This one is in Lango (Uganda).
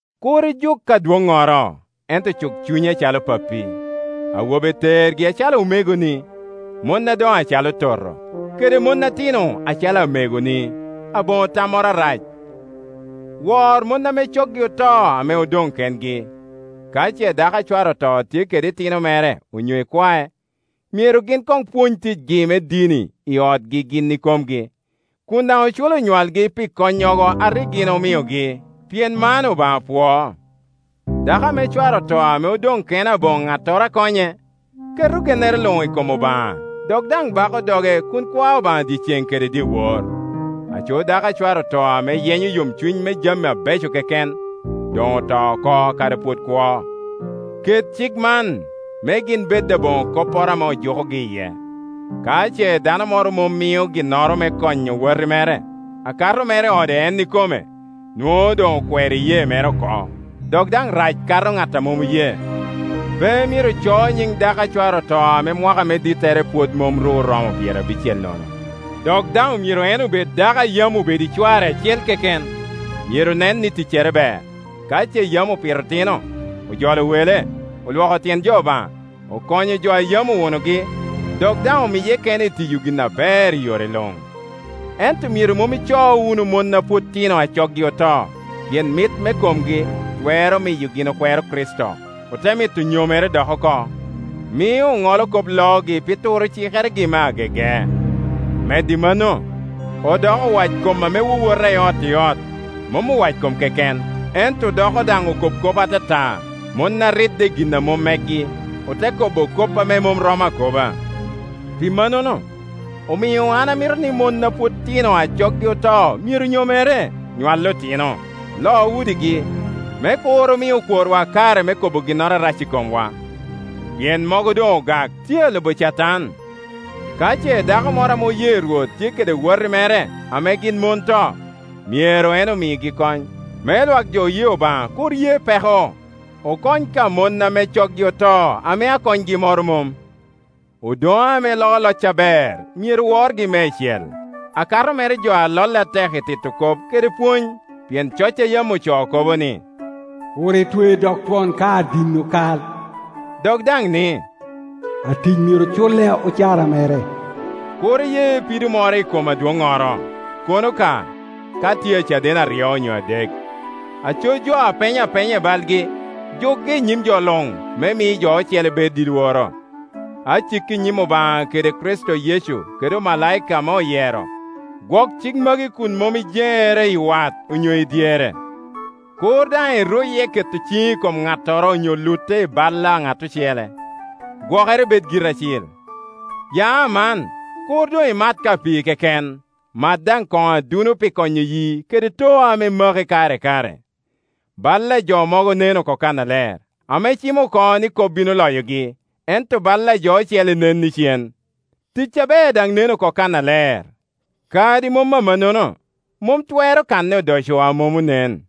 Kur ijuk adwoŋŋoro, ento cuk cunye acalo pappi; awobe tergi acalo omegoni, mon adoŋo acalo toto, kede mon atino acalo amegoni, aboŋo tammoro arac. Wor mon ame coggi oto ame odoŋ kengi. Ka ce dako a cware oto tye kede itino mere onyo ikwae, myero gin koŋ pwony ticgi me dini i otgi gin ikomgi, kun daŋ oculo onywalgi pi konnyogo a rik gin omiogi, pien man Obaŋa pwoo. Dako ame cware oto ame odoŋ kene aboŋo ŋattoro a konye, keto gennere luŋ i kom Obaŋa dok daŋ bako doge kun kwao Obaŋa dyecen kede dyewor. Aco dako a cware oto ame yenyo yomcuny me jami abeco keken, doŋ oto oko kadi pwod kwo. Ket cik man, me gin bed aboŋo kopporo ame ojukogi iye. Ka ce dano moro mom mio ginnoro me konyo wati mere, akato mere ode en ikome, nwoŋo doŋ okwero iyee mere oko, dok daŋ rac kato ŋat a mom oye. Pe myero co nyiŋ dako a cware oto ame mwaka me dittere pwod mom ru oromo pyerabicel nono, dok daŋ myero en obed dako a yam obedo i cware acel keken. Myero nen ni ticcere ber, ka ce yam opito otino, ojolo wele, olwoko tyen jo Obaŋa, okonyo jo a yam owunogi, dok daŋ omiye kene i tiyo gin aber i yore luŋ. Ento myero mom ico wunu mon a pwod tino a coggi oto; pien mit me komgi twero miyo gin okwero Kricito, ote mito nyomere dok oko; mio oŋolo kop loogi pi turo cikeregi me agege. Medo i mano, odoko owackom ame wowota i ot i ot; mom owackom keken, ento odoko daŋ okob kop atata, mon a ridde i gin a mom megi, ote kobo kop ame mom romo akoba. Pi mannono, omio an amito ni mon a pwod tino a coggi oto myero nyomere, nywal otino, lo udigi, me kur omi okworwa kare me kobo ginnoro arac i komwa. Pien mogo doŋ ogak, tye a lubo Catan. Ka ce dako moro ame oye Rwot tye kede wati mere ame gin mon to, myero en omigi kony; me lwak jo oye Obaŋa kur ye peko, okony ka mon ame coggi oto ame akonygi moro mom. Odoŋe ame loo loc aber myero worgi meicel, akato mere jo ame lolle atek i tito kop kede pwony. Pien coc a yam ocoo kobo ni, “Kur itwe dog twon ka adino kal,” dok daŋ ni, “Atic myero culle ocara mere.” Kur iye pido moro i kom adwoŋŋoro, kono ka, ka tye caden aryo onyo adek. Aco jo ame peny apenya i balgi, jukgi i nyim jo luŋ, me mi jo ocele bed i lworo. Aciki i nyim Obaŋa kede Kricito Yecu kede omalaika ame oyero, gwok cik magi kun mom ijeŋere i wat onyo i dyere. Kur daŋ iruye keto ciŋi i kom ŋattoro onyo lutte i bal a ŋat ocele; gwokere ibed giri acil. Ya aman, kur doŋ imat ka pii keken, mat daŋ koŋo aduno pi konyo yii kede too ame maki kare i kare. Bal a jo mogo nen oko kannaler, ame cimo oko ni kop bino loyogi, ento bal a jo ocele nen icen. Tic aber daŋ nen oko kannaler; kadi mom amannono, mom twero kanne odoco a mom onen.